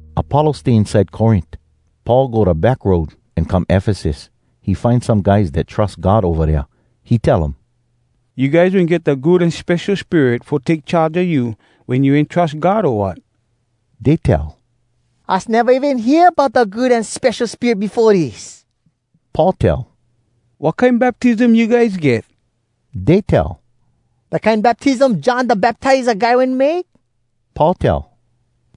Apollos stay inside Corint. Paul go da back road, an come Efesus. He find some guys dat trus God ova dea. He tell um, “You guys wen get da Good An Spesho Spirit fo take charge a you wen you wen trus God, o wat?” Dey tell, “Us neva even hear bout da Good An Spesho Spirit befo dis.” Paul tell, “Wat kine baptism you guys get?” Dey tell, “Da kine baptism John Da Baptiza Guy wen make.” Paul tell,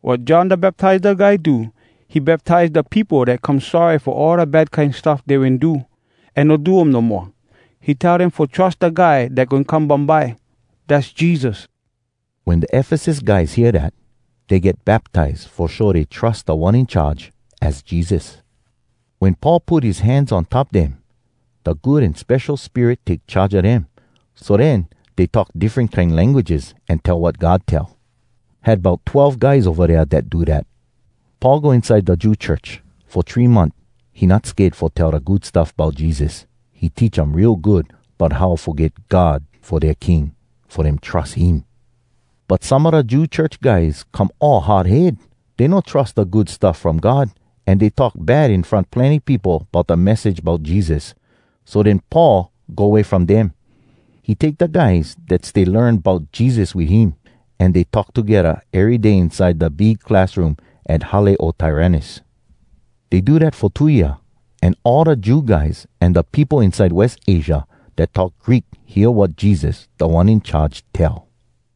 “Wat John Da Baptiza Guy do, he baptize da peopo dat come sorry fo all da bad kine stuff dey wen do, an no do um no moa. He tell dem fo trus da Guy dat goin come bumbye. Dass Jesus.” Wen da Efesus guys hear dat, dey get baptize fo show dey trus Da One In Charge, az Jesus. Wen Paul put his hands on top dem, da Good An Spesho Spirit take charge a dem. So den dey talk diffren kine languages, an tell wat God tell. Had bout twelve guys ova dea dat do dat. Paul go inside da Jew church. Fo three month he not sked fo tell da Good Stuff Bout Jesus. He teach um real good bout how fo get God fo dea king, fo dem trus him. But some a da Jew church guys come all hard head. Dey no trus da Good Stuff from God, an dey talk bad in front plenny peopo bout da message bout Jesus. So den Paul go way from dem. He take da guys dat stay learn bout Jesus wit him, an dey talk togedda ery day inside da big classroom at Hale O Tyrannus. Dey do dat fo two year, an all da Jew guys an da peopo inside West Asia dat talk Greek hear wat Jesus, Da One In Charge, tell.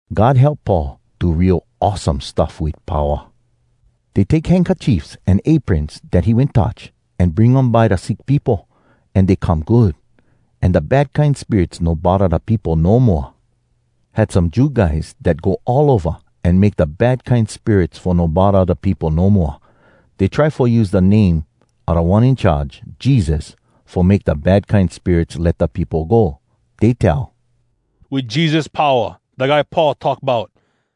God help Paul do real awesome stuff wit powa. Dey take handkerchiefs an aprons dat he wen touch, an bring um by da sick peopo, an dey come good. An da bad kine spirits no bodda da peopo no moa. Had some Jew guys dat go all ova an make da bad kine spirits fo no bodda da peopo no moa. Dey try fo use da name a Da One In Charge, Jesus, fo make da bad kine spirits let da peopo go. Dey tell, “Wit Jesus powa, da guy Paul talk bout,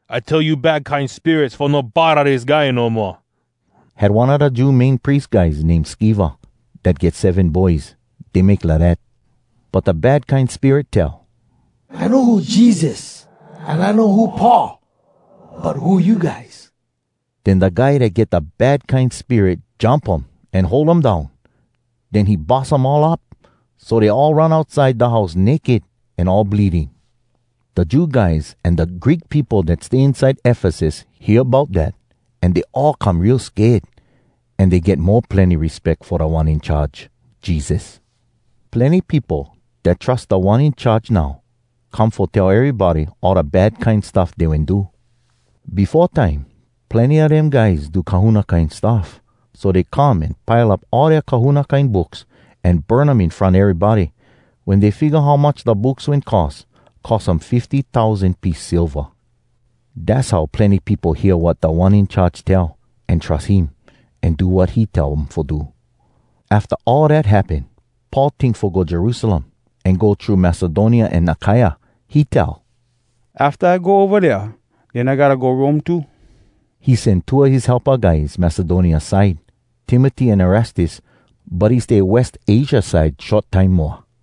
I tell you bad kine spirits fo no bodda dis guy no moa.” Had one a da Jew Main Pries guys name Skeva dat get seven boys. Dey make lidat. But da bad kine spirit tell, “I know who Jesus, an I know who Paul, but who you guys?” Den da guy dat get da bad kine spirit jump um an hold um down. Den he bus um all up. So dey all run outside da house naked an all bleeding. Da Jew guys an da Greek peopo dat stay inside Efesus hear bout dat, an dey all come real sked. An dey get mo plenny respeck fo Da One In Charge, Jesus. Plenny peopo dat trus Da One In Charge now, come fo tell erybody all da bad kine stuff dey wen do. Befo time, plenny a dem guys do kahuna kine stuff. So dey come an pile up all dea kahuna kine books, an burn um in front erybody. Wen dey figga how much da books wen cost, cost um fifty tousan piece silva. Dass how plenny peopo hear wat Da One In Charge tell, an trus him, an do wat he tell um fo do. Afta all dat happen, Paul tink fo go Jerusalem, an go thru Macedonia an Akaia. He tell, “Afta I go ova dea, den I gotta go Rome too.” He sen two a his helpa guys Macedonia side, Timoty an Erastus. But he stay West Asia side short time moa.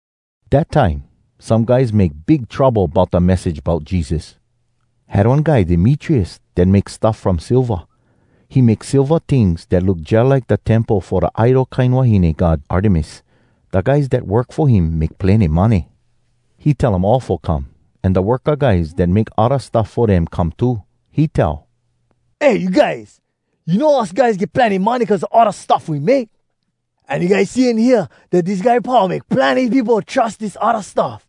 Dat time some guys make big trouble bout da message bout Jesus. Had one guy Demetrius dat make stuff from silva. He make silva tings dat look jalike da temple fo da idol kine wahine god Artemis. Da guys dat work fo him make plenny money. He tell um all fo come, an da worka guys dat make odda stuff fo dem come too. He tell, “Eh, you guys, you know us guys get plenny money cuz a all da stuff we make. An you guys see an hear dat dis guy Paul make plenny peopo trus dis odda stuff.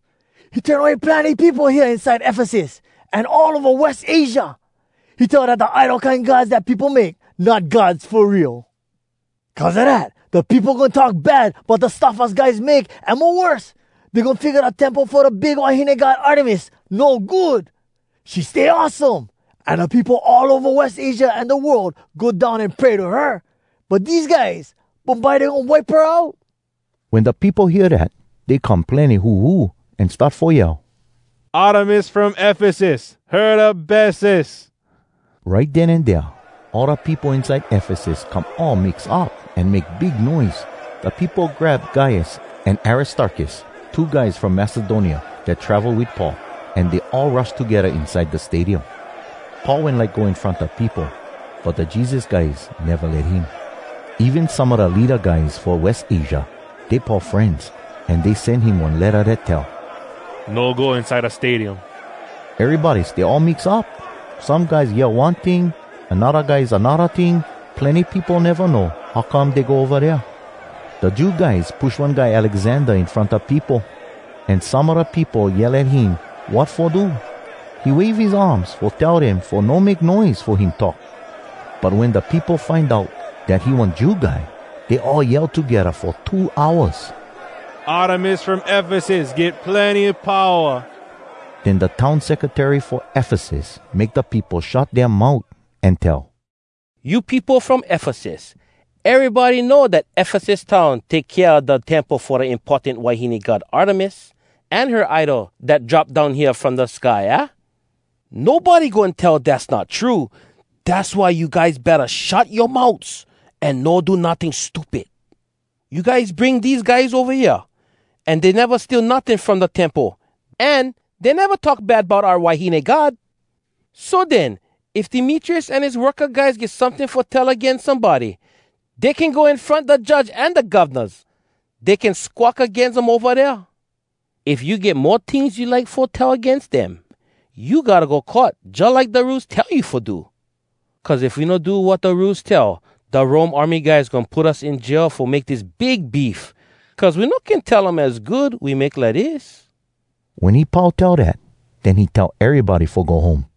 He turn away plenny peopo hea inside Efesus, an all ova West Asia. He tell dat da idol kine gods da peopo make, not gods fo real. Cuz a dat, da peopo goin talk bad bout da stuff us guys make, an mo worse, dey goin figga da temple fo da big wahine god Artemis no good. She stay awesome, an da peopo all ova West Asia an da world go down an pray to her. But dese guys, bumbye dey goin wipe her out!” Wen da peopo hear dat, dey come plenny huhu, an start fo yell, “Artemis from Efesus! Her Da Bestes!” Right den an dea, all da peopo inside Efesus come all mix up an make big noise. Da peopo grab Gaius an Aristarkus, two guys from Macedonia dat travel wit Paul, an dey all rush togedda inside da stadium. Paul wen like go in front da peopo, but da Jesus guys neva let him. Even some a da leada guys fo West Asia, dey Paul frenz, an dey sen him one letta dat tell, “No go inside da stadium!” Erybody stay all mix up. Some guys yell one ting, an odda guys anodda ting. Plenny peopo neva know how come dey go ova dea. Da Jew guys push one guy Alexander in front da peopo, an some a da peopo yell at him wat fo do. He wave his arms fo tell dem fo no make noise fo him talk. But wen da peopo find out dat he one Jew guy, dey all yell togedda fo two hours, “Artemis from Efesus get plenny powa!” Den da town secretary fo Efesus make da peopo shut dea mout, an tell, “You peopo from Efesus! Erybody know dat Efesus town take kea a da temple fo da importan wahine god Artemis, an her idol dat drop down hea from da sky, aah? Nobody goin tell dass not true! Dass why you guys betta shut yoa mouts an no do notting stupid. You guys bring dese guys ova hea, an dey neva steal notting from da temple, an dey neva talk bad bout oua wahine god. So den, if Demetrius an his worka guys get someting fo tell agains somebody, dey can go in front da judge an da govnas. Dey can squawk agains um ova dea. If you get mo tings you like fo tell agains dem, you gotta go court jalike da rules tell you fo do. Cuz if we no do wat da rules tell, da Rome army guys goin put us in jail fo make dis big beef, cuz we no can tell um az good we make lidis.” Wen he pau tell dat, den he tell erybody fo go home.